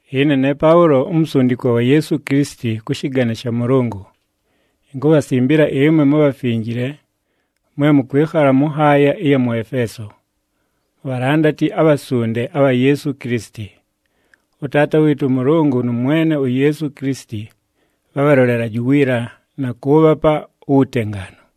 Ɨne ne Paʉlo, umusundikwa wa Yeesu Kilisiti kʉ shɨgane sha Mʉlʉngʉ. Inkubhasimbila ɨmwe mubhafinjile [mwe mʉkwɨkhala mʉ nhaaya ɨya mʉ Efeeso], mubhalandati abhasunde abha Yeesu Kilisiti. ɄTaata wɨɨtʉ ʉMʉlʉngʉ nʉ Mwene uYeesu Kilisiti bhabhalolelaje uwiila na kʉʉbhapa uwutengaanu.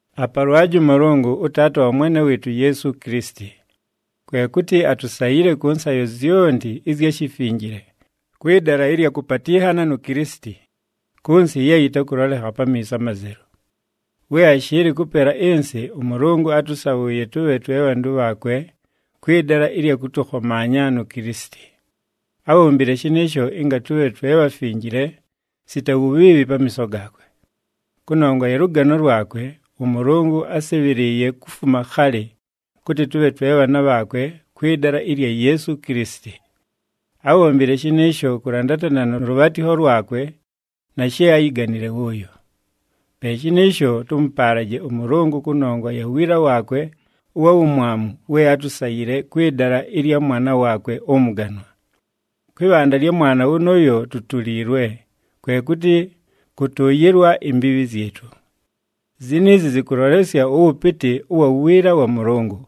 Apalwaje ʉMʉlʉngʉ, ʉTaata wa Mwene wɨɨtʉ uYeesu Kilisiti. Kwe kʉtɨ atusayile kʉ nsayo zyonti ɨzya shifinjile kwɨ dala ɨlya kʉpatɨnhana nu Kilisiti, kʉ nsɨ ye yɨtakʉlolekha pamiiso amazelu. We ashɨɨlɨ kʉpela ɨnsɨ, ʉMʉlʉngʉ átʉsabhʉʉye tʉbhe twe bhantʉ bhaakwe kwɨ dala ɨlya kʉtʉkhomaanya nu Kilisiti. Ábhombile shɨnɨɨsho ɨnga tʉbhe twe bhafinjile sita wubhiibhi pamiiso gaakwe. Kʉnongwa ya lʉgano lwakwe, ʉMʉlʉngʉ ásɨbhɨlɨɨye kufuma khalɨ, kʉtɨ tʉbhe twe bhaana bhaakwe kwɨ dala ɨlya Yeesu Kilisiti. Ábhombile shɨnɨɨsho kʉlandatana nʉ lʉbhaatɨkho lwakwe na she áyiganile wʉʉyo. Pe shɨnɨɨsho, tʉmʉpaalaje ʉMʉlʉngʉ kʉnongwa ya wiila waakwe ʉwa wumwamu we átusayile kwɨ dala ɨlya Mwana waakwe ʉmʉganwa. Kwɨ bhanda lya Mwana wʉnʉʉyo tutuliilwe, kwe kʉtɨ kʉtʉʉyɨlwa imbiibhi zyɨtʉ. Ziniizi zɨkʉlolesya ʉwʉpɨtɨ ʉwa wiila wa Mʉlʉngʉ.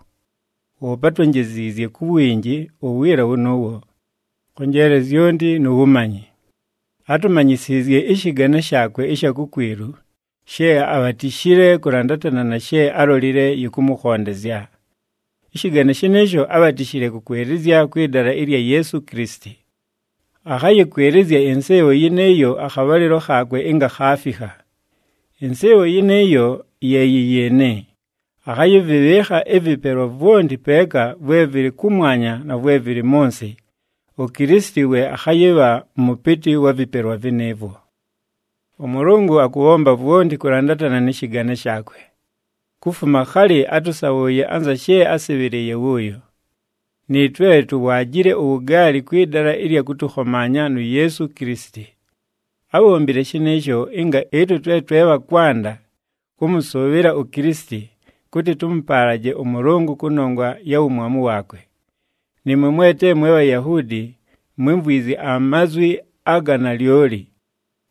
Woope átwonjeziizye ku winji uwiila wʉnʉʉwo, kʉ njeele zyonti nu wumanyi. Átumanyisiizye ɨshɨgane shaakwe ɨsha kukwilu, she abhatishile kʉlandatana na she álolile yɨkʉmʉkhondezya. Ɨshɨgane shɨnɨɨsho ábhatishile kʉkwɨlɨzya kwɨ dala ɨlya Yeesu Kilisiti. Akhayɨkwɨlɨzya ɨnsɨɨbho yɨnɨɨyo akhabhalɨlo khaakwe ɨnga khaafikha. Ɨnsɨɨbho yɨnɨɨyo ye yɨ yɨɨnɨ: akhayɨvɨbhɨɨkha ɨvɨpelwa vwonti peeka, vwe vɨlɨ kʉmwanya na vwe vɨlɨ mʉ nsɨ, uKilisiti we akhayɨbha mʉpɨtɨ wa vɨpelwa vɨnɨɨvwo. ɄMʉlʉngʉ akʉbhomba vwonti kʉlandatana nɨ shɨgane shaakwe. Kufuma khaali átʉsabhʉʉye anza she ásɨbhɨlɨɨye wʉʉyo. Nɨɨtwe tuwaajile uwugaali kwɨ dala ɨlya kʉtʉkhomaanya nu Yeesu Kilisiti. Ábhombile shɨnɨɨsho ɨnga ɨtwe twe twe bha kwanda kʉmʉsʉʉbhɨla uKilisiti, kʉtɨ tʉmʉpaalaje ʉMʉlʉngʉ kʉnongwa ya wumwamu waakwe. Nɨɨmwe mwe te mwe Bhayahuudi mwímvwizye amazwi aga nalyoli,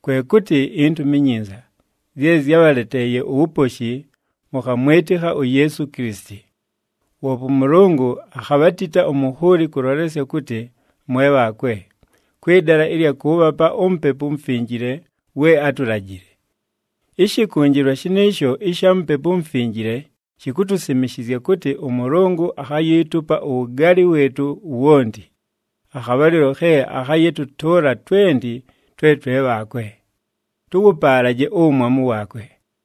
kwe kʉtɨ iNtumi iNyinza, zye zyábhaleteeye uwuposhi, mʉkhamwɨtɨkha uYeesu Kilisiti. Woope ʉMʉlʉngʉ akhabhatita umunhuuli kʉlolesya kʉtɨ mwe bhaakwe, kwɨ dala ɨlya kʉʉbhapa uMupepu uMufinjile we átulajile. Ɨshɨkʉnjɨlwa shɨnɨɨsho ɨsha Mupepu uMufinjile shikutusimishizya kʉtɨ ʉMʉlʉngʉ akhayiitupa uwugaali wɨɨtʉ wonti, akhabhalɨlo khe akhayɨtʉtʉʉla twenti twe twe bhaakwe. Tʉwʉpaalaje uwumwamu waakwe!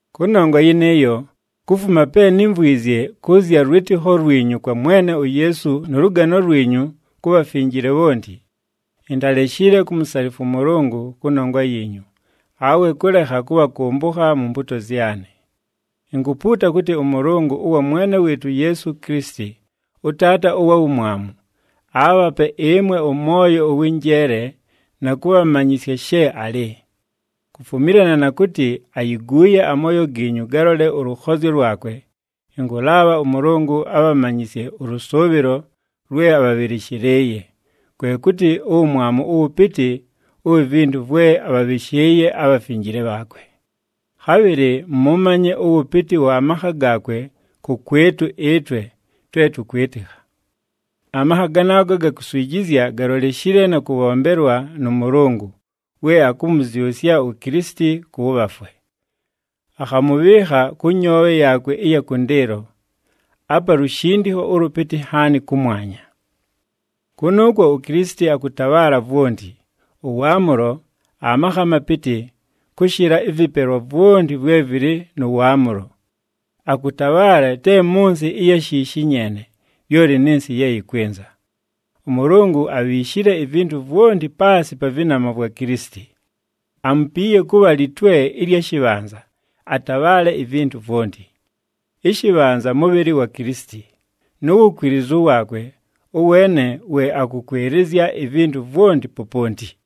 Kʉnongwa yɨnɨɨyo, kufuma pe nímvwizye kʉ zya lwɨtɨkho lwinyu kwa Mwene uYeesu nʉ lʉgano lwinyu ku bhafinjile bhonti, intaleshile kumusalifwa ʉMʉlʉngʉ kʉnongwa yiinyu, awe kʉlekha kʉbhakʉmbʉkha mu mpuuto zyanɨ. Inkupuuta kʉtɨ ʉMʉlʉngʉ ʉwa Mwene wɨɨtʉ uYeesu Kilisiti, ʉTaata ʉwa wumwamu, aabhape ɨmwe ʉmwoyo ʉwɨ njeele na kʉbhamanyɨsya she alɨ. Kufumilana na kʉtɨ ayiguuye amooyo giinyu galole ʉlʉkhozyo lwakwe, ɨnkʉlaabha ʉMʉlʉngʉ abhamanyɨsye ʉlʉsʉʉbhɨlo lwe abhabhɨlɨshɨlɨɨye, kwe kʉtɨ uwumwamu ʉwʉpɨtɨ uwi vintu vwe abhabhɨshɨɨye abhafinjile bhaakwe. Khabhɨlɨ mʉmanye ʉwʉpɨtɨ wa makha gaakwe kʉkwɨtʉ ɨtwe twe tʉkwɨtɨkha. Amakha ganaago aga kuswijizya galoleshile na kʉbhombelwa nʉ Mʉlʉngʉ, we akʉmʉzyʉsya uKilisiti kʉ bhafwe. Akhamʉbhɨɨkha kʉ nyoobhe yaakwe ɨya kʉndɨɨlo, apa lushindikho ʉlʉpɨtɨ nhaani, kʉmwanya. Kʉnʉʉkwo uKilisiti akʉtabhaala vwonti, ʉwaamʉlo, amakha amapɨtɨ, kʉshɨla ɨvɨpelwa vwonti vwe vɨlɨ nʉ waamʉlo. Akʉtabhaala te mʉ nsɨ ɨya shiishi nyeene, lyoli nɨ nsɨ ye yɨkwɨnza. ɄMʉlʉngʉ abhiishile ivintu vwonti paasɨ pa vɨnama vwa Kilisiti. Amupiiye kʉbha Litwe ɨlya shɨbhanza, atabhaale ivintu vwonti. Ɨshɨbhanza mʉbhɨlɨ wa Kilisiti, nu wukwilizu waakwe, ʉweene we akʉkwɨlɨzya ivintu vwonti poponti.